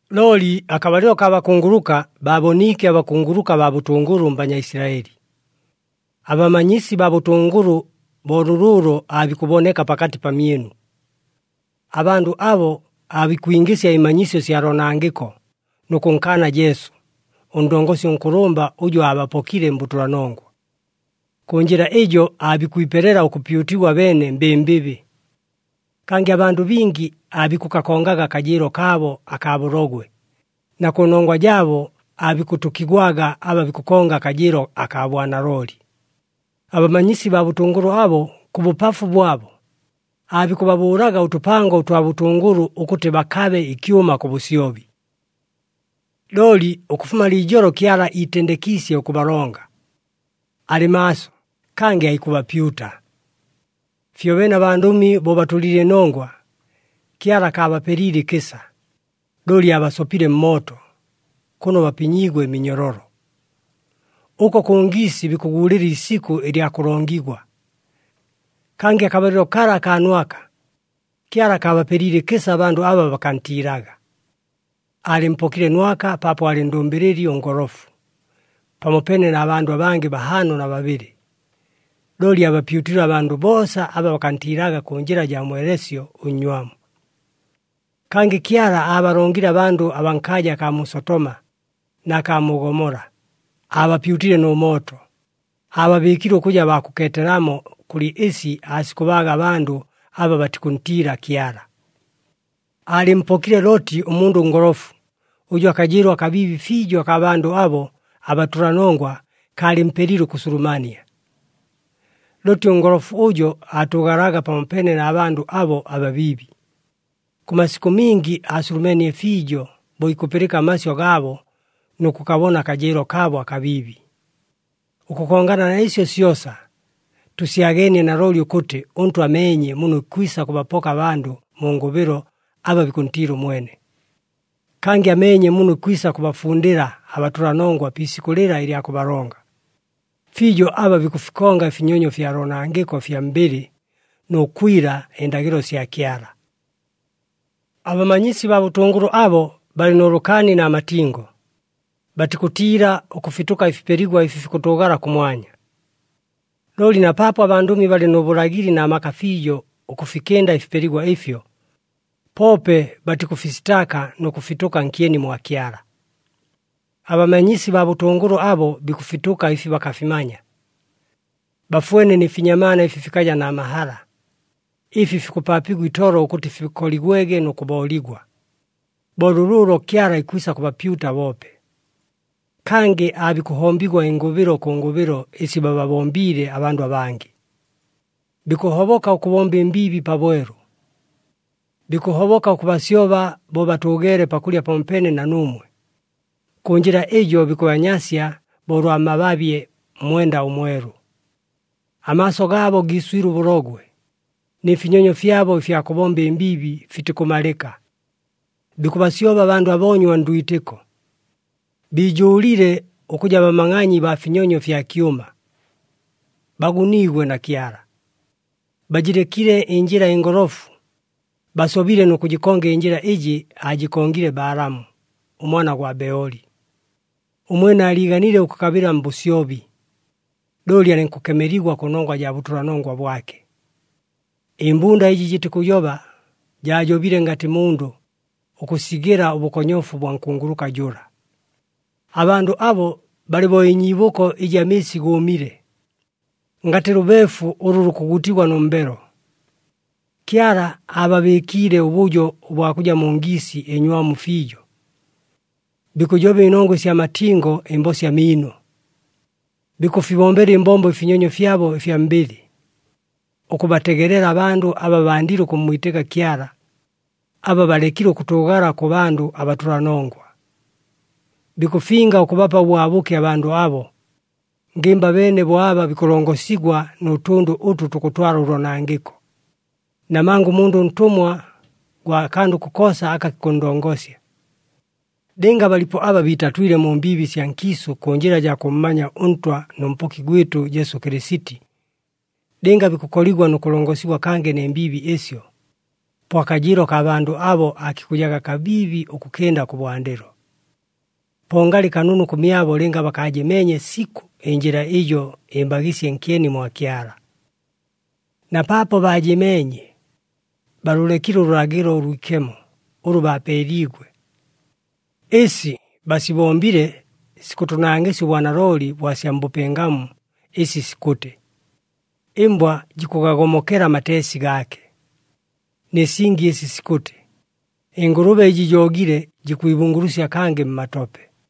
Looli akabalɨlo kaa bakunguluka, baaboniike abakunguluka baa bʉtʉngʉlʉ mBanyaisilaɨli. Abamanyisi baa bʉtʉngʉlʉ bo lʉlʉʉlo aabikʉboneka pakatɨ pamyɨnu. Abandʉ abo aabikwingɨsya ɨmanyisyo sya loonangɨko, nʉ kʉnkaana Jesu, ʉNdongosi ʉNkʉlʉmba ʉjʉ aabapokile mbʉtʉlanongwa. Kʉ njɨla ɨjo aabikwipelela ʉkʉpyutigwa abeene mbɨmbɨbɨ. Kangɨ abandʉ bingi aabikʉkakongaga akajɨɨlo kaabo akaa bʉlogwe, na kʉnongwa jaabo aabikʉtʉkigwaga aba bikʉkonga akajɨɨlo akaa bwanalooli. Abamanyisi baa bʉtʉngʉlʉ abo, kʉ bʉpafu bwabo, aabikʉbabʉʉlaga ʉtʉpango ʉtwa bʉtʉngʉlʉ ʉkʉtɨ bakabe ɨkyʉma kʉ bʉsyobi. Looli ʉkʉfuma liijolo Kyala iitendekiisye ʉkʉbalonga. Alɨ maaso, kangɨ aikʉbapyuta! Fyobeene abandʉmi bo batʉlile ɨnongwa, Kyala akaabapeliile ɨkɨsa, looli aabasopile mmooto, kʉno bapinyiigwe ɨminyololo. Ʉko kʉ ngiisi bikʉguulɨla iisikʉ ɨlya kʉlongigwa. Kangɨ akabalɨlo kala akaa Nwaka, Kyala akaabapeliile ɨkɨsa abandʉ aba bakantiilaga. Aalɨmpokile Nwaka paapo aalɨ ndʉmbɨlɨli ʉngolofu, pamopeene na bandʉ abangɨ bahaano na babɨlɨ, looli aabapyutile abandʉ boosa aba bakantiilaga kʉ njɨla jaa mweleesyo ʉnnywamu. Kangɨ Kyala aabalongile abandʉ abaa nkaaja akaa mu Sotoma na kaa mu Gomola, aabapyutile nʉ mooto, aababɨɨkile ʉkʉja baa kʉkeetelamo kʉlɨ ɨsi aasikʉbaaga abandʉ aba batikʉntiila Kyala. Aalɨmpokile Looti ʉmundʉ ʉngolofu, ʉjʉ akajɨɨlo akabiibi fiijo akaa bandʉ abo abatʉlanongwa kaalɨmpelile ʉkʉsulumania. Looti ʉngolofu ʉjo aatʉʉgalaga pamopeene na bandʉ abo ababiibi, kʉ masikʉ mingi aasulumeenie fiijo bo ikʉpɨlɨka amasyʉ gaabo nʉ kʉkabona akajɨɨlo kaabo akabiibi. Ʉkʉkongana na ɨsyo syosa, tʉsyageenie nalooli ʉkʉtɨ ʉNtwa ameenye muno ikwisa kʉbapoka abandʉ mu ngʉbɨlo aba bikʉntiila ʉmwene. Kangɨ ameenye muno ikwisa kʉbafundɨla abatʉlanongwa pi isikʉ lɨla ɨlya kʉbalonga, fiijo aba bikʉfikonga ɨfinyonyo fya loonangɨko ɨfya mbɨlɨ, nʉ kwila ɨndagɨlo sya Kyala. Abamanyisi baa bʉtʉngʉlʉ abo balɨ nʉ lʉkaani na matingo, batikʉtiila ʉkʉfitʉka ɨfipeligwa ɨfi fikʉtʉʉgala kʉmwanya. Looli na paapo abandʉmi balɨ nʉ bʉlagɨli na maka fiijo ʉkʉfikɨnda ɨfipeligwa ɨfyo, poope batikʉfisitaaka nʉ kʉfitʉka nkyeni mwa Kyala. Abamanyisi baa bʉtʉngʉlʉ abo bikʉfitʉka ɨfi bakafimanya. Bafwene nɨ finyamaana ɨfi fikaja na mahala, ɨfi fikʉpaapigwa itolo ʉkʉtɨ fikoligwege nʉ kʉbooligwa! Bo lʉlʉʉlo Kyala ikwisa kʉbapyuta boope. Kangɨ aabikʉhombigwa ɨngʉbɨlo kʉ ngʉbɨlo ɨsi bababombiile abandʉ abangɨ. Bikʉhoboka ʉkʉbomba ɨmbiibi pabwelu. Bikʉhoboka ʉkʉbasyoba bo batʉʉgeele pakʉlya pamopeene na nuumwe. Kʉ njɨla ɨjo bikʉbanyasya bo ʉlwa mababye mmwenda ʉmwelu. Amaaso gaabo giiswile ʉbʉlogwe, nɨ finyonyo fyabo ɨfya kʉbomba ɨmbiibi fitikʉmalɨka. Bikʉbasyoba abandʉ aboonywa ndwitɨko. Biijʉʉlile ʉkʉja bamangʼanyi baa finyonyo fya kyʉma. Baguniigwe na Kyala! Bajɨlekile ɨnjɨla ɨngolofu, basobile nʉ kʉjɨkonga ɨnjɨla ɨjɨ aajɨkongile Balaamu, ʉmwana gwa Beoli. Ʉmwene aaliiganile ʉkʉkabɨla mbʉsyobi, looli alɨnkʉkemeligwa kʉnongwa jaa bʉtʉlanongwa bwake. Ɨmbunda ɨjɨ jɨtikʉjoba, jaajobile ngatɨ mundʉ, ʉkʉsigɨla ʉbʉkonyofu bwa nkunguluka jʉla. Abandʉ abo balɨ bo ɨnyiibʉko ɨjɨ amɨɨsi gʉʉmile, ngatɨ lʉbeefu ʉlʉ lukʉgutigwa nʉ mbelo. Kyala aababɨɨkiile ʉbʉjo ʉbwa kʉja mu ngiisi ɨnywamu fiijo. Bikʉjoba ɨnongwa ɨsya matingo ɨmbosya miino. Bikʉfibombela ɨmbombo ɨfinyonyo fyabo ɨfya mbɨlɨ, ʉkʉbategelela abandʉ aba bandile ʉkʉmmwitɨka Kyala, aba balekile ʉkʉtʉʉgala kʉ bandʉ abatʉlanongwa. Bikʉfinga ʉkʉbapa ʉbwabʉke abandʉ abo, ngɨmba abeene bo aba bikʉlongosigwa nʉ tʉndʉ ʉtʉ tukʉtwala ʉloonangɨko. Namanga ʉmundʉ ntʉmwa gwa kandʉ kokoosa aka kikʉnndongosya. Lɨnga balipo aba biitatwile mu mbiibi sya nkiisʉ kʉ njɨla jaa kʉmmanya ʉNtwa nʉ Mpoki gwɨtʉ Jesu Kɨlɨsiti, lɨnga bikʉkoligwa nʉ kʉlongosigwa kangɨ nɨ mbiibi ɨsyo, po akajɨɨlo kaa bandʉ abo aakikʉjaga kabiibi ʉkʉkɨnda kʉbwandɨlo. Po ngalɨ kanunu kʉmyabo lɨnga bakaajɨmeenye sikʉ ɨnjɨla ɨjo ɨmbagɨsye nkyeni mwa Kyala. Na paapo baajɨmeenye, baalʉlekile ʉlʉlagɨlo ʉlwikemo ʉlʉ baapeeliigwe. Ɨsi basibombile sikʉtʉnangɨsya ʉbwanalooli bwa sya mbʉpɨngamu ɨsi sikʉtɨ, “Ɨmbwa jikʉgagomokela amateesi gaake,” nɨ singi ɨsi sikʉtɨ, “Ɨngʉlʉbe ɨjɨ joogile jikwibungulusya kangɨ mmatope!”